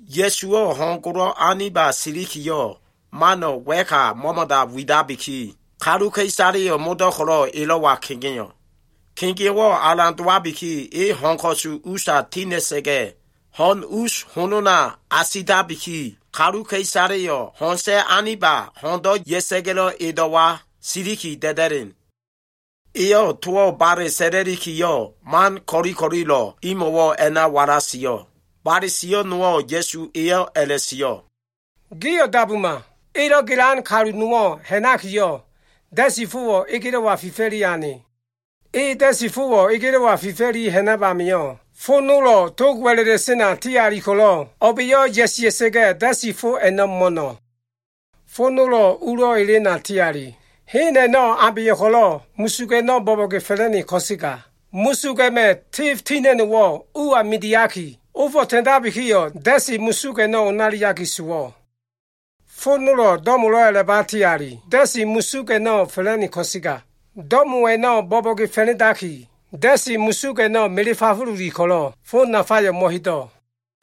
Ya꞉suwo꞉ ho꞉n golo꞉ aniba silikiyo꞉, mano꞉ wa꞉ka mo꞉mo꞉da widabiki, kaluka꞉isaleyo꞉ modo꞉ ko꞉lo꞉ elo꞉wa kegeo꞉. Kegeo꞉wo꞉ alan dowabiki, e ho꞉n ko꞉su usa tina꞉sa꞉ga꞉, ho꞉n us honona asitabiki, kaluka꞉isaleyo꞉ ho꞉n sa꞉ aniba ho꞉ndo꞉ ya꞉sa꞉ga꞉lo꞉ edo꞉wa siliki da꞉da꞉len. Eyo꞉ towo꞉ bale sa꞉la꞉likiyo꞉, man ko꞉li ko꞉lilo꞉ a꞉no꞉ imo꞉wo꞉ a꞉na walasio꞉. Bale sio꞉ nowo꞉ Ya꞉su eyo꞉ a꞉la꞉sio꞉, “Gio꞉ dabuma! Elo꞉ gelan kalu nowo꞉ ha꞉nakiyo꞉, da꞉si fowo꞉ egelo꞉wa fifa꞉li ane. E da꞉si fowo꞉ egelo꞉wa fifa꞉li ha꞉nab amio꞉, fo nolo꞉ tog wa꞉la꞉la꞉sena ti ali ko꞉lo꞉, o꞉ba꞉yo꞉ ya꞉sia꞉sa꞉ga꞉, da꞉si fo a꞉no꞉ mo꞉no꞉. Fo nolo꞉ ulo꞉ elena ti ali. Hen a꞉no꞉ abeyo꞉ ko꞉lo꞉ musug a꞉no꞉ bo꞉bo꞉ge fa꞉la꞉ne ko꞉sega, musug a꞉ma꞉ tef tina꞉no꞉wo꞉ uwa midiyo꞉ ko꞉lo꞉, ofo꞉ ta꞉ndabikiyo꞉, da꞉si musug a꞉no꞉ onaliaki sowo꞉. Fo nolo꞉ do꞉molo꞉ a꞉laba ti ali. Da꞉si musug a꞉no꞉ fa꞉la꞉ne ko꞉sega, do꞉mo a꞉no꞉ bo꞉bo꞉ge fa꞉la꞉ndaki, da꞉si musug a꞉no꞉ mele fafululi ko꞉lo꞉, fo nafayo꞉ mo꞉hedo꞉.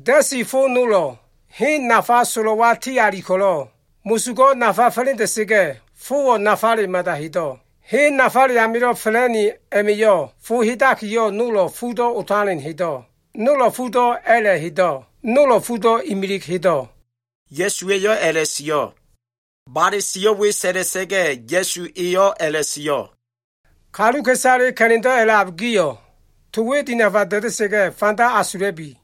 Da꞉si fo nolo꞉ hen nafa solo꞉wa ti ali ko꞉lo꞉, musugo꞉ nafa fa꞉la꞉nda꞉sa꞉ga꞉, fowo꞉ nafale mada hedo꞉. Hen nafale amilo꞉ fa꞉la꞉ne a꞉ma꞉yo꞉, fo hedakiyo꞉ nolo꞉ fudo꞉ otalen hedo꞉, nolo꞉ fudo꞉ a꞉la꞉ hedo꞉, nolo꞉ fudo꞉ imilig hedo꞉.” Ya꞉su eyo꞉ a꞉la꞉sio꞉. Bale sio꞉ we sa꞉la꞉sa꞉ga꞉, Ya꞉su eyo꞉ a꞉la꞉sio꞉, “Kaluka꞉isale ka꞉la꞉ndo꞉ a꞉lab gio꞉, to we dinafa da꞉da꞉sa꞉ga꞉ fanda asula꞉bi.”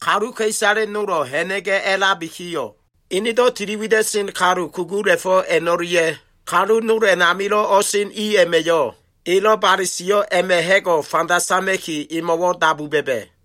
Kaluka꞉isale nolo꞉ ha꞉na꞉ga꞉ a꞉labikiyo꞉, enedo꞉ tili wida꞉sen kalu kugula꞉fo꞉ a꞉no꞉lia꞉ kalu nol a꞉namilo꞉ o꞉sen i a꞉ma꞉yo꞉, elo꞉ bale sio꞉ a꞉ma꞉ ha꞉go꞉ fanda sama꞉ki emo꞉wo꞉ dabu ba꞉ba꞉.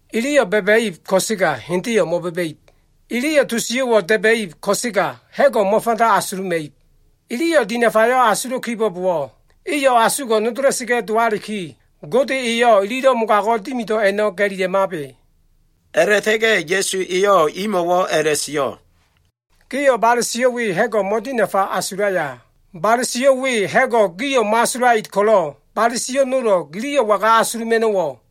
“‘Iliyo꞉ ba꞉ba꞉ib ko꞉sega, hendeyo꞉ mo꞉ba꞉ba꞉ib. Iliyo꞉ to sio꞉wo꞉ da꞉ba꞉ib ko꞉sega, ha꞉go꞉ mo꞉fanda asuluma꞉ib. Iliyo꞉ dinafayo꞉ asulo꞉ kibo꞉bowo꞉, iyo꞉ asugo꞉ nodola꞉sa꞉ga꞉ dowaliki, Gode eyo꞉ ililo꞉ mogago꞉ dimido꞉ a꞉no꞉ ga꞉lila꞉mabe.’” A꞉la꞉ta꞉ga꞉ Ya꞉su eyo꞉ imo꞉ a꞉la꞉sio꞉, “Gio꞉ bale sio꞉ we ha꞉go꞉ mo꞉dinafa asulaya? Bale sio꞉ we ha꞉go꞉ gio꞉ mo꞉asulait ko꞉lo꞉, bale sio꞉ nolo꞉ giliyo꞉ waga asuluma꞉no꞉wo꞉?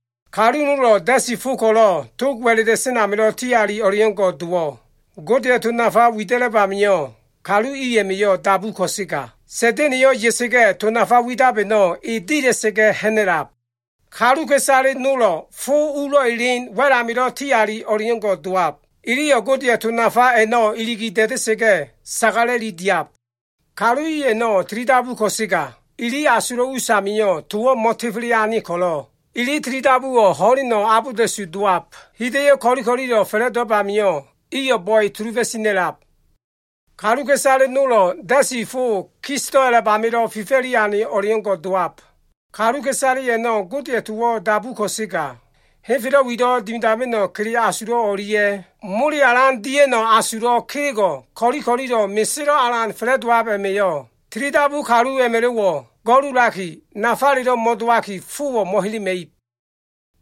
Kaluka꞉isale nolo꞉ da꞉si fo ko꞉lo꞉ tog wa꞉la꞉la꞉sen amilo꞉ ti ali o꞉leo꞉ngo꞉ dowab. Godeya꞉ to nafa wida꞉lab amio꞉, kalu i a꞉ma꞉yo꞉ dabu ko꞉sega, Sa꞉da꞉na꞉yo꞉ ya꞉sa꞉ga꞉ to nafa widab a꞉no꞉ e dila꞉sa꞉ga꞉ ha꞉na꞉lab. Kaluka꞉isale nolo꞉ fo ulo꞉ elen wa꞉l amilo꞉ ti ali o꞉leo꞉ngo꞉ dowab. Iliyo꞉ Godeya꞉ to nafa a꞉no꞉ iligi da꞉da꞉sa꞉ga꞉, sagala꞉li diab. Kalu i a꞉no꞉ tilidabu ko꞉sega, ili asulo꞉ us amio꞉ towo꞉ mo꞉tefele ane ko꞉lo꞉, ili tilidabuwo꞉ ho꞉len abolda꞉su dowab. Hida꞉yo꞉ ko꞉li ko꞉lilo꞉ fa꞉la꞉dowab amio꞉, iyo꞉ bo꞉e sulufo꞉ tina꞉lab. Kaluka꞉isale nolo꞉ da꞉si fo kisdo꞉ a꞉lab a꞉namilo꞉ fifa꞉li ane o꞉leo꞉ngo꞉ dowab. Kaluka꞉isale a꞉no꞉ Godeya꞉ towo꞉ dabu ko꞉sega, henfelo꞉ wilo꞉ dimidama꞉no꞉ kele asulo꞉ o꞉lia꞉, mole alan dia꞉no꞉ asulo꞉ kelego꞉ ko꞉li ko꞉lilo꞉ meselo꞉ alan fa꞉la꞉dowab a꞉ma꞉yo꞉ tilidabu kalu a꞉ma꞉lo꞉wo꞉ go꞉lulaliki, nafalelo꞉ mo꞉dowaki, fowo꞉ mo꞉helema꞉ib.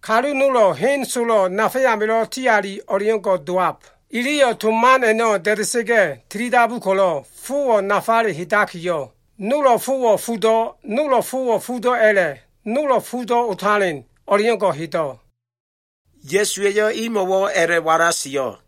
Kalu nolo꞉ hen solo꞉ nafa amilo꞉ ti ali o꞉leo꞉ngo꞉ dowab. Iliyo꞉ to man a꞉no꞉ da꞉da꞉sa꞉ga꞉ tilidabu ko꞉lo꞉, fowo꞉ nafale hedakiyo꞉, nolo꞉ fowo꞉ fudo꞉, nolo꞉ fowo꞉ fudo꞉ a꞉la꞉, nolo꞉ fudo꞉ otalen o꞉leo꞉ngo꞉ hedo꞉.” Ya꞉suwa꞉yo꞉ imo꞉wo꞉ a꞉la꞉walasio꞉.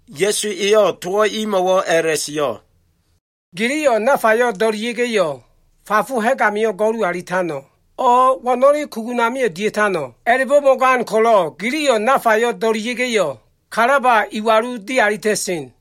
Ya꞉su eyo꞉ towo꞉ imo꞉wo꞉ a꞉la꞉sio꞉, “Giliyo꞉ nafayo꞉ do꞉lia꞉ga꞉yo꞉, fafo ha꞉g amio꞉ go꞉lu alitano꞉? O꞉ wo꞉no꞉le kugun amio꞉ dia꞉tano꞉? A꞉la꞉bo꞉ mo꞉gan ko꞉lo꞉ giliyo꞉ nafayo꞉ do꞉lia꞉ga꞉yo꞉, kalaba iwalu dialita꞉sen.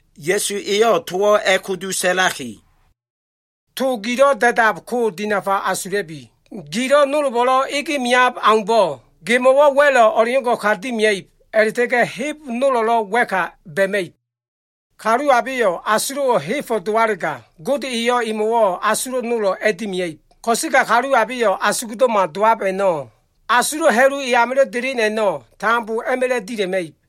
Ya꞉su eyo꞉ towo꞉ a꞉kudu sa꞉laki, “To gilo꞉ da꞉dab ko dinafa asula꞉bi. Gilo꞉ nolbo꞉lo꞉ ege meab aumbo꞉, gemo꞉wo꞉ wa꞉lo꞉ o꞉leo꞉ngo꞉ ka dimia꞉ib a꞉la꞉ta꞉ga꞉ heb nolo꞉lo꞉ wa꞉ka ba꞉ma꞉ib. Kalu abeyo꞉ asulo꞉wo꞉ hebo꞉ dowalega, Gode eyo꞉ emo꞉wo꞉ asulo꞉ nolo꞉ a꞉dimia꞉ib. Ko꞉sega kalu abeyo꞉ asugdo꞉ma dowab a꞉no꞉, asulo꞉ ha꞉lu e amilo꞉ delen a꞉no꞉, tambo a꞉ma꞉la꞉ dila꞉ma꞉ib.”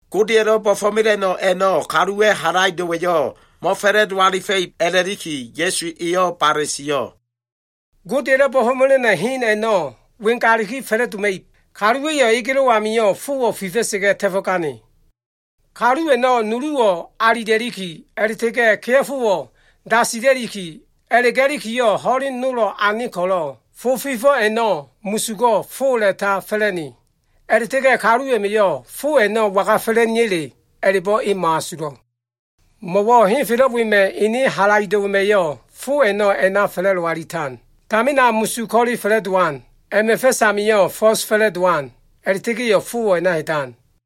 Godeya꞉lo꞉ bo꞉fo꞉mela꞉no꞉ a꞉no꞉ kaluwa꞉ halaido꞉wa꞉yo꞉ mo꞉fa꞉la꞉do alifa꞉ib a꞉la꞉liki, Ya꞉su eyo꞉ bale sio꞉. “Godeya꞉lo꞉ bo꞉fo꞉mela꞉no꞉ hen a꞉no꞉ wengaliki fa꞉la꞉doma꞉ib. Kaluwa꞉yo꞉ egelo꞉ amio꞉ fowo꞉ fifa꞉sa꞉ga꞉ ta꞉fo꞉gane. Kalu a꞉no꞉ nuluwo꞉ alila꞉liki, a꞉la꞉ta꞉ga꞉ kea꞉fowo꞉ dasila꞉liki, a꞉la꞉ga꞉likiyo꞉ ho꞉len nolo꞉ ane ko꞉lo꞉, fo fifo꞉ a꞉no꞉ musugo꞉ po a꞉la꞉ta fa꞉la꞉ne. A꞉la꞉ta꞉ga꞉ kalu a꞉ma꞉yo꞉ fo a꞉no꞉ waga fa꞉la꞉neya꞉le, a꞉la꞉bo꞉ e mo꞉asulo꞉. Mo꞉wo꞉ henfelo꞉ wema꞉ ene halaido꞉wa꞉yo꞉ fo a꞉no꞉ a꞉na fa꞉la꞉do alitan. Tamina musug ko꞉le fa꞉la꞉dowan. A꞉ma꞉ fa꞉s amio꞉ fo꞉s fa꞉la꞉dowan. A꞉la꞉ta꞉ga꞉yo꞉ fowo꞉ a꞉na hedan.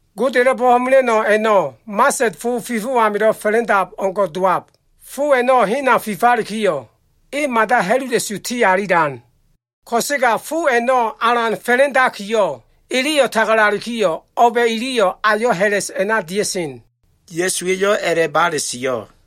Godeya꞉lo꞉ bo꞉fo꞉mela꞉no꞉ a꞉no꞉ mased fo fifo꞉ amilo꞉ fa꞉la꞉ndab o꞉ngo꞉ dowab. Fo a꞉no꞉ hena fifalikiyo꞉, e mada ha꞉lula꞉su ti alilan. Ko꞉sega fo a꞉no꞉ alan fa꞉la꞉ndakiyo꞉, eleyo꞉ tagalalikiyo꞉, o꞉ba꞉ iliyo꞉ ayo꞉ ha꞉la꞉s a꞉na dia꞉sen.” Ya꞉suwa꞉yo꞉ a꞉la꞉ bale sio꞉.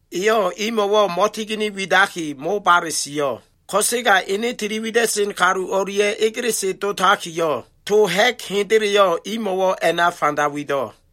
Eyo꞉ imo꞉wo꞉ mo꞉tigini widaki, mobale sio꞉. Ko꞉sega enedo꞉ tiliwida꞉sen kalu o꞉lia꞉ egelese dotakiyo꞉, to ha꞉g hendeleyo꞉ imo꞉wo꞉ a꞉na fanda wido꞉.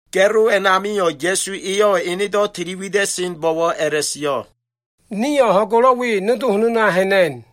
Ga꞉lo a꞉namio꞉, Ya꞉su eyo꞉ enedo꞉ tili wida꞉senbo꞉wo꞉ a꞉la꞉sio꞉, “Nio꞉ ho꞉n golo꞉ we nodo honona ha꞉na꞉n.”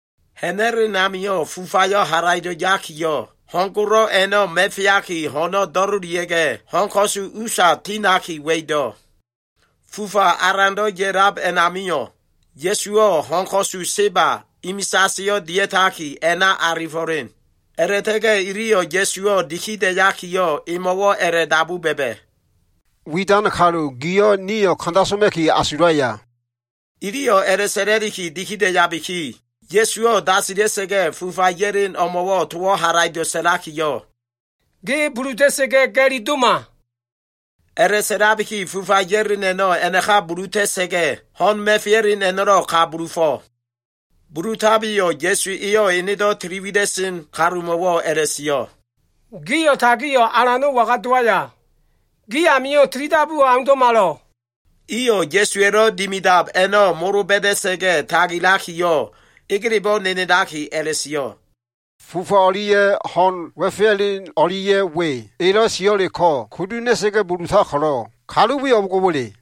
Ha꞉na꞉len amio꞉, fufayo꞉ halaido꞉ yakiyo꞉, ho꞉n golo꞉ a꞉no꞉ ma꞉feaki, ho꞉no꞉ do꞉lilia꞉ga꞉, ho꞉n ko꞉su usa tinaki wa꞉ido꞉. Fufa alando꞉ ya꞉lab a꞉namio꞉, Ya꞉suwo꞉ ho꞉n ko꞉su seba, imisaseyo꞉ dia꞉taki, a꞉na alifo꞉len. A꞉la꞉ta꞉ga꞉ iliyo꞉ Ya꞉suwo꞉ digida꞉yakiyo꞉, emo꞉wo꞉ a꞉la꞉dabu ba꞉ba꞉, “Widan kalu, giyo꞉ nio꞉ kanda soma꞉ki asulaya?” Iliyo꞉ a꞉la꞉sa꞉la꞉liki digida꞉yabiki, Ya꞉suwo꞉ dasila꞉sa꞉ga꞉, fufa ya꞉len o꞉mo꞉ towo꞉ halaido꞉ sa꞉lakiyo꞉, “Ge buluta꞉sa꞉ga꞉, ga꞉li doma!” A꞉la꞉sa꞉labiki, fufa ya꞉len a꞉no꞉ a꞉naka bulutakiyo꞉, ho꞉n ma꞉feya꞉len a꞉no꞉lo꞉ ka bulufo꞉. Bulutabiyo꞉ Ya꞉su eyo꞉ enedo꞉ tili wida꞉sen kalumo꞉wo꞉ a꞉la꞉sio꞉, “Gio꞉ tagio꞉ alano꞉ waga dowaya? Gi amio꞉ tilidabuwo꞉ aundo꞉malo꞉?” Iyo꞉ Ya꞉suwa꞉lo꞉ dimidab a꞉no꞉ molo ba꞉da꞉sa꞉ga꞉ tagilakiyo꞉, egelebo꞉ nenelaki a꞉la꞉sio꞉, “Fufa o꞉lia꞉ ho꞉n ma꞉feya꞉len o꞉lia꞉ we elo꞉ sio꞉leko꞉ kudu ha꞉na꞉sa꞉ga꞉ bulutab ko꞉lo꞉, kalu we o꞉bo꞉ngo꞉wa꞉le?”